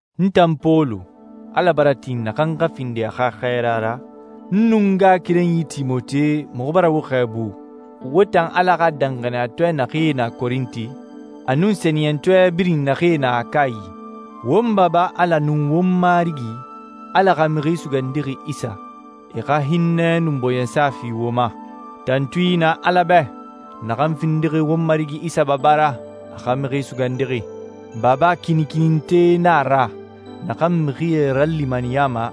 N tan Pɔlu, Ala bara tin naxan xa findi a xa xɛɛra ra, n nun n ngaxakerenyi Timote, muxu bara wo xɛɛbu, wo tan Ala xa danxaniyatɔɛ naxee na Korinti, a nun sɛniyɛntɔɛ birin naxee na Akayi. Won Baba Ala nun won Marigi, Ala xa Mixi Sugandixi Isa, e xa hinnɛ nun bɔɲɛsa fi wo ma. Tantui na Ala bɛ, naxan findixi won Marigi Isa Baba ra, a xa Mixi Sugandixi. Baba kinikininte na a ra, naxan mixie ralimaniyama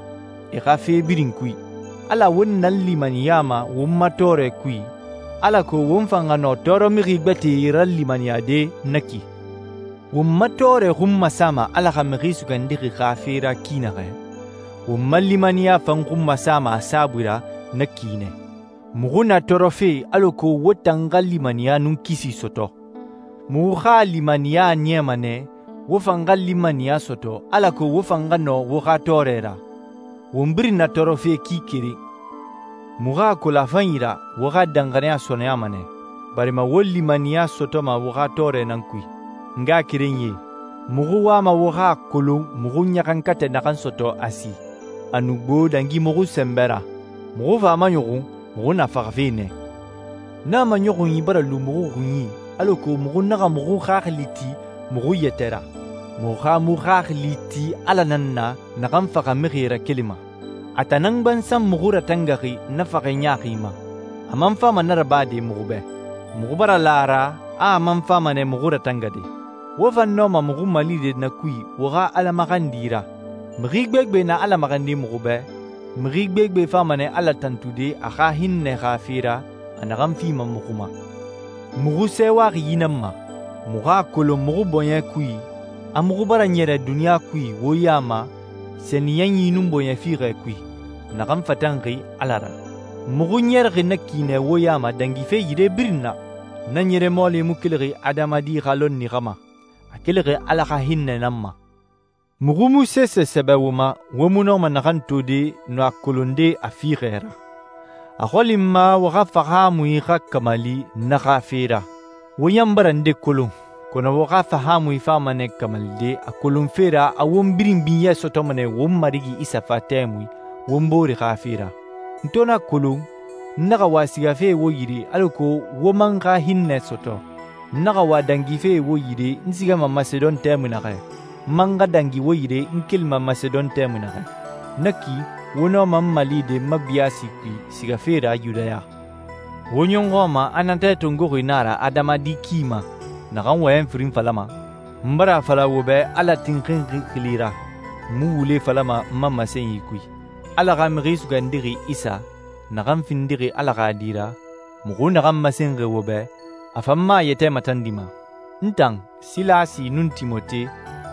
e xa fe birin kui. Ala won nalimaniyama won ma tɔɔrɛ kui, alako won fan xa nɔ tɔɔrɔmixi gbɛtɛe ralimaniyade na ki. Won ma tɔɔrɛ xun masama Ala xa Mixi Sugandixi xa fe ra ki naxɛ, won ma limaniya fan xun masama a saabui ra na ki nɛ. Muxu na tɔɔrɔfe alako wo tan xa limaniya nun kisi sɔtɔ. Muxu xa limaniya a niyama nɛ wo fan xa limaniya sɔtɔ alako wo fan xa nɔ wo xa tɔɔrɛ ra. Won birin na tɔɔrɔfe ki keren. Muxu a kolon a fanyi ra wo xa danxaniya sɔɔnɛyama nɛ, barima wo limaniya sɔtɔma wo xa tɔɔrɛ nan kui. N ngaxakerenyie, muxu wama wo xa a kolon muxu ɲaxankatɛ naxan sɔtɔ Asi. A nu gbo dangi muxu sɛnbɛ ra, muxu fa a maɲɔxun muxu na faxafe nɛ. Na maɲɔxunyi bara lu muxu xunyi alako muxu naxa muxu xaxili ti muxu yɛtɛ ra, muxu xa muxu xaxili ti Ala nan na naxan faxamixie rakelima. A tan nan gbansan muxu ratangaxi na faxɛ ɲaaxi ma. A man fama na rabade muxu bɛ. Muxu bara la a ra a man fama nɛ muxu ratangade. Wo fan nɔma muxu malide na kui wo xa Ala maxandi ra. Mixi gbegbe na Ala maxandi muxu bɛ, mixi gbegbe fama nɛ Ala tantude a xa hinnɛ xa fe ra a naxan fima muxu ma. Muxu sɛɛwaxi yi nan ma. Muxu a kolon muxu bɔɲɛ kui a muxu bara ɲɛrɛ duniɲa kui wo ya ma sɛniyɛnyi nun bɔɲɛ fiixɛ kui, naxan fatanxi Ala ra. Muxu ɲɛrɛxi na ki nɛ wo ya ma dangife yire birin na. Na ɲɛrɛ mɔɔli mu kelixi adamadi xa lɔnni xa ma. A kelixi Ala xa hinnɛ nan ma. Muxu mu sese sɛbɛ wo ma wo mu nɔma naxan tode nun a kolonde a fiixɛ ra. A xɔli n ma wo xa fahaamui xa kamali na xa fe ra. Wo ɲan bara nde kolon, kɔnɔ wo xa fahaamui fama nɛ kamalide a kolonfe ra a won birin binyɛ sɔtɔma nɛ won Marigi Isa fa tɛmui won bore xa fe ra. N to na kolon, n naxa wa sigafe wo yire alako wo man xa hinnɛ sɔtɔ. N naxa wa dangife wo yire n sigama Masedon tɛmui naxɛ, n man xa dangi wo yire n kelima Masedon tɛmui naxɛ. Na ki wo nɔma n malide n ma biyaasi kui sigafe ra Yudaya. Wo ɲɔxɔ a ma natɛ tongoxi na a ra adamadi ki ma, naxan wɔyɛn firin falama? N bara a fala wo bɛ Ala tinxinxi xili ra, n mu wule falama n ma masenyi kui. Ala xa Mixi Sugandixi Isa, naxan findixi Ala xa Di ra, muxu naxan masenxi wo bɛ, a fan mu a yɛtɛ matandima. N tan, Silasi, nun Timote,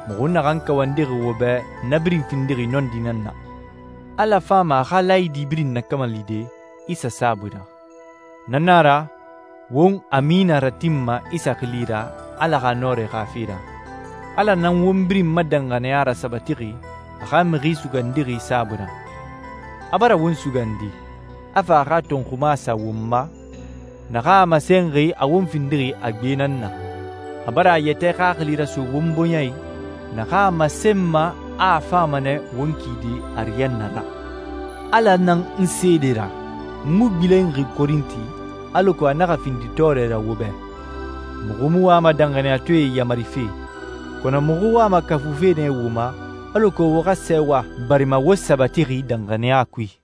muxu naxan kawandixi wo bɛ, na birin findixi nɔndi nan na. Ala fama a xa laayidi birin nakamalide Isa saabui ra. Na nan a ra won «Amina» ratinma Isa xili ra Ala xa nɔrɛ xa fe ra. Ala nan won birin ma danxaniya rasabatixi a xa Mixi Sugandixi saabui ra. A bara won sugandi, a fa a xa tɔnxuma sa won ma, naxan a masenxi a won findixi a gbe nan na. A bara a yɛtɛ Xaxili raso won bɔɲɛ i naxan a masenma a fama nɛ won kide ariyanna ra. Ala na n seede ra. N mu gbilenxi Korinti, alako a naxa findi tɔɔrɛ ra wo bɛ. Muxu mu wama danxaniyatɔɛe yamarife, kɔnɔ muxu wama kafufe nɛ wo ma alako wo xa sɛɛwa barima wo sabatixi danxaniya kui.